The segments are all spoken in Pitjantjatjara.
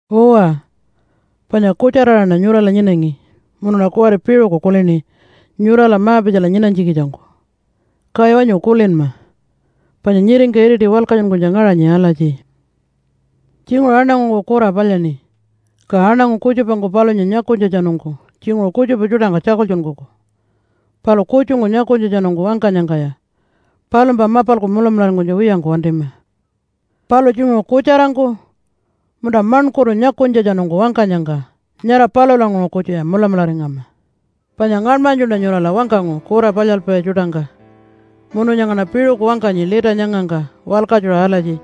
Uwa, panya kutjara-aṟaṉa nyurala nyinangi munuṉa kuwari piṟuku kulini nyurala ma-pitjala nyinanytjikitjangku. Kaya wanyu kulinma, panya nyiringka iriti walkatjunkunytja ngaṟanyi alatji, “Tjinguṟu aṉangungku kura palyaṉi. Ka aṉangu kutjupangku palunya nyakunytjatjanungku tjinguṟu kutjupa tjuṯangka tjakultjunkuku. Palu kutjungku nyakunytjatjanungku wangkanyangkaya palumpa mapalku mulamularingkunytja wiyangku wantima, palu tjinguṟu kutjarangku, munta maṉkurtu nyakunytjatjanungku wangkanyangka nyara palulanguṟu kutjuya mulamularingama.” Panya ngaṉmanytjuṉa nyurala wangkangu kura palyalpai tjuṯangka munu nyangaṉa piṟuku wangkanyi lita nyangangka walkatjuṟa alatji.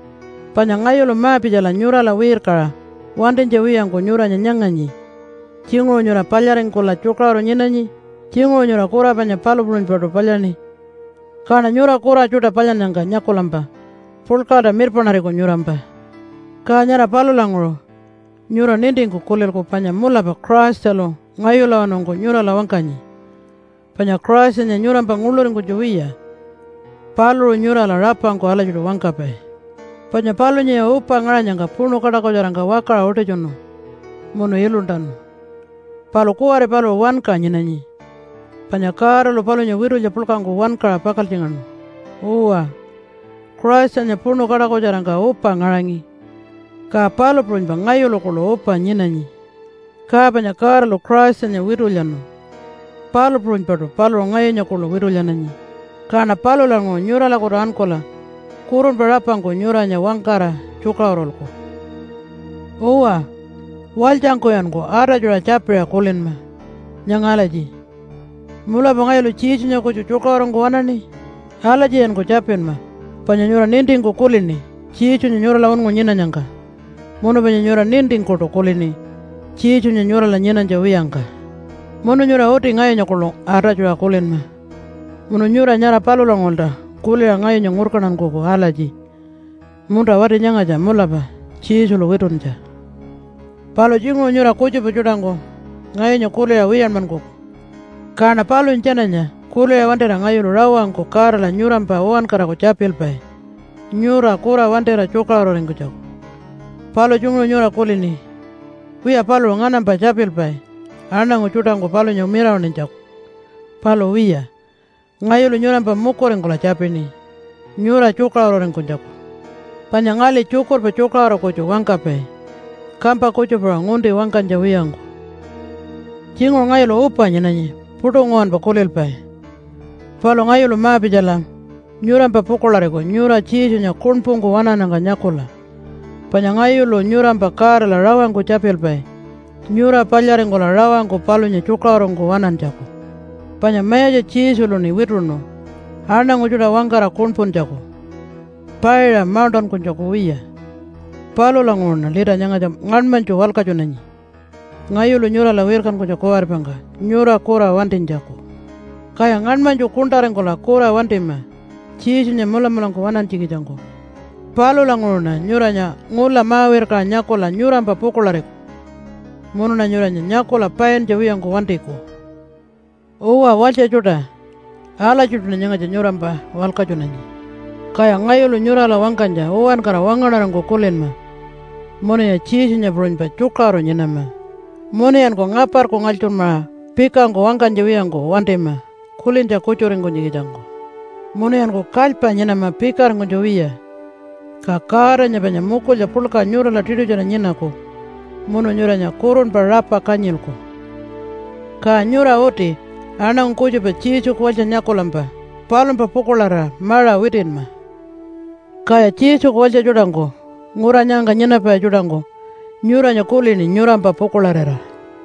Panya ngayulu ma-pitjala nyurala wirkaṟa wantinytja wiyangku nyuranya nyanganyi tjinguṟu nyura palyaringkula tjukaṟuru nyinanyi, tjinguṟu nyura kura panya palu puṟunypaṯu palyaṉi. Kaṉa nyura kura tjuṯa palyannyangka nyakulampa puḻkaṟalta mirpaṉariku nyurampa. Ka nyara palulanguṟu nyura nintingku kulilku panya mulapa Christalu ngayulawanungku nyurala wangkanyi. Panya Christanya nyurampa nguḻuringkunytja wiya, paluṟu nyurala rapangku alatjiṯu wangkapai. Panya palunyaya upa ngaṟanyangka puṉu kaṯakutjarangka wakaṟa utitjunu munu iluntanu. Palu kuwari paluṟu wanka nyinanyi panya Godalu palunya witulya puḻkangku wankaṟa pakaltjingaṉu. Uwa, Christanya puṉu kaṯakutjarangka upa ngaṟangi, ka palu puṟunypa ngayulu kuḻu upa nyinanyi. Ka panya Godalu Christanya witulyanu, palu puṟunypaṯu paluṟu ngayunya kuḻu witulyananyi. Kaṉa palulanguṟu nyuralakutu ankula kurunpa rapangku nyuranya wangkara tjukaṟurulku. Uwa, walytjangkuyanku atatjuṟa tjapiṟa kulinma nyanga alatji, “Mulapa ngayulu Jesunya kutju tjukaṟurungku waṉaṉi?” Alatjiyanku tjapinma, panya nyura nintingku kulini Jesunya nyurala unngu nyinanyangka. Munu panya nyura nintingkuṯu kulini Jesunya nyurala nyinanytja wiyangka. Munu nyura uti ngayunya kuḻu atatjuṟa kulinma, munu nyura nyara palulanguṟulta kuliṟa ngayunya ngurkantankuku alatji, “Munta, wati nyangatja mulapa Jesulu wituntja.” Palu tjinguṟu nyura kutjupa tjuṯangku ngayunya kuliṟa wiyanmankuku, kaṉa palunya tjananya kuliṟa wantira ngayulu rawangku Godala nyurampa uwankaraku tjapilpai nyura kura wantira tjukaṟururingkunytjaku. Palu tjinguṟu nyura kulini, “Wiya, paluṟu nganampa tjapilpai aṉangu tjuṯangku palunya mirawaṉinytjaku.” Palu wiya, ngayulu nyurampa mukuringkula tjapini nyura tjukaṟururingkunytjaku. Panya ngali tjukurpa tjukaṟuru kutju wangkapai kampa kutjupaṟa ngunti wangkanytja wiyangku. Tjinguṟu ngayulu upa nyinanyi puṯu nguwanpa kulilpai. Palu ngayulu ma-pitjala nyurampa pukuḻariku nyura Jesunya kuṉpungku waṉannyangka nyakula. Panya ngayulu nyurampa Godala rawangku tjapilpai nyura palyaringkula rawangku palunya tjukaṟurungku waṉantjaku. Panya Mayatja Jesuluṉi wituṉu aṉangu tjuṯa wangkara kuṉpuntjaku, paiṟa mauṉṯankunytjaku wiya. Palulanguṟuṉa lita nyangatja ngaṉmanytju walkatjunanyi ngayulu nyurala wirkankunytja kuwaripangka nyura kura wantinytjaku. Kaya ngaṉmanytju kuṉṯaringkula kura wantima Jesunya mulamulangku waṉantjikitjangku. Palulanguṟuṉa nyuranya ngula ma-wirkaṟa nyakula nyurampa pukuḻariku, munuṉa nyuranya nyakula paintja wiyangku wantiku. Uwa, walytja tjuṯa! Alatjiṯuṉa nyangatja nyurampa walkatjunanyi. Kaya ngayulu nyurala wangkanytja uwankara wangaṉarangku kulinma munuya Jesunya puṟunypa tjukaṟuru nyinama. Munuyanku ngaparku ngalytjurmaṟa pikangku wangkanytja wiyangku wantima kulintja kutjuringkunytjikitjangku. Munuyanku kalypa nyinama pikaringkunytja wiya. Ka Godanya panya mukulya puḻka nyurala tiṯutjara nyinaku munu nyuranya kurunpa rapa kanyilku. Ka nyura uti aṉangu kutjupa Jesuku walytja nyakulampa palumpa pukuḻarira maṟa witinma. Kaya Jesuku walytja tjuṯangku ngura nyangangka nyinapai tjuṯangku nyuranya kulini nyurampa pukuḻarira.